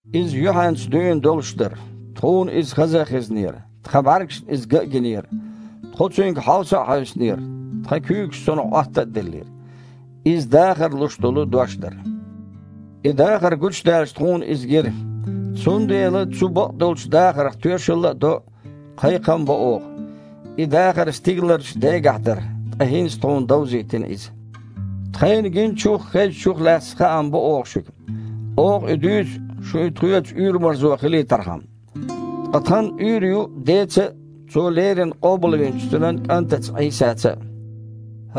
Иза юьхьанца дуьйна долуш дара. Тхуна иза хаза а хезнера, тхан бІаьргашна иза ган а гинера. Тхо цуьнга хьовса а хьаьвсинера, тхан куьйгаш цунах Іотта а деллера. Иза дахар луш долу Дош дара. И дахар гучудаьлча, тхуна иза гира. Цундела цу бакъдолчу дахарх тоьшалла а до, кхайкхам а бо оха. И дахар стигаларчу Дегахь дара, ткъа хІинца тхуна довзийтина иза. Тхайна гиначух а, хезначух а лаьцна хаам бо оха шуьга. Оха и дуьйцу, шун а тхоьца уьйр-марзо хилийтархьама. Ткъа тхан уьйр ю Деца а, Цо леррина къобалвинчу Цуьнан КІантаца Іийсаца а.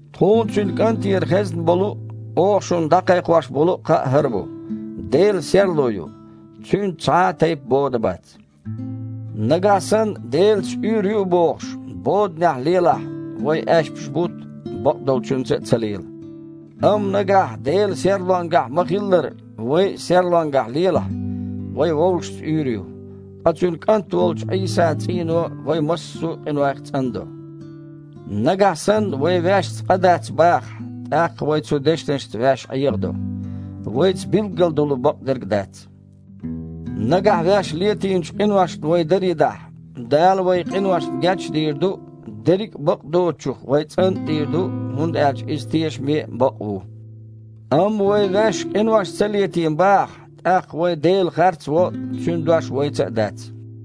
Тхуна Цуьнан КІантера хезна болу а, оха шуна дІакхайкхош болу а кхаъ хІара бу: Дела – серло ю, Цуьнца цхьа а тайпа бода бац. Нагахь санна Делаца уьйр ю а бохуш, боданехь лелахь, вай аьшпаш а бутту, бакъдолчуьнца а ца лела. Амма, нагахь Дела серлонгахь ма-хиллара, вай а серлонгахь лелахь, вайн вовшашца уьйр ю, ткъа Цуьнан КІант волчу Іийсан цІийно вай массо а къинойх цІандо. Нагахь санна вай ваьшца къа дац бахахь, тІаккха вай цу дешнашца ваьш Іехадо, вайца билггал долу бакъдерг а дац. Нагахь ваьш летийначу къиношна вай даре дахь, Дала вайн къиношна геч а дийр ду, дерриг а бакъдоцучух вай цІан а дийр ду, хІунда аьлча Иза тешаме а, бакъ а ву. Амма вай ваьш къинош ца летийна бахахь, тІаккха вай Дела харц а во, Цуьнан Дош вайца а дац.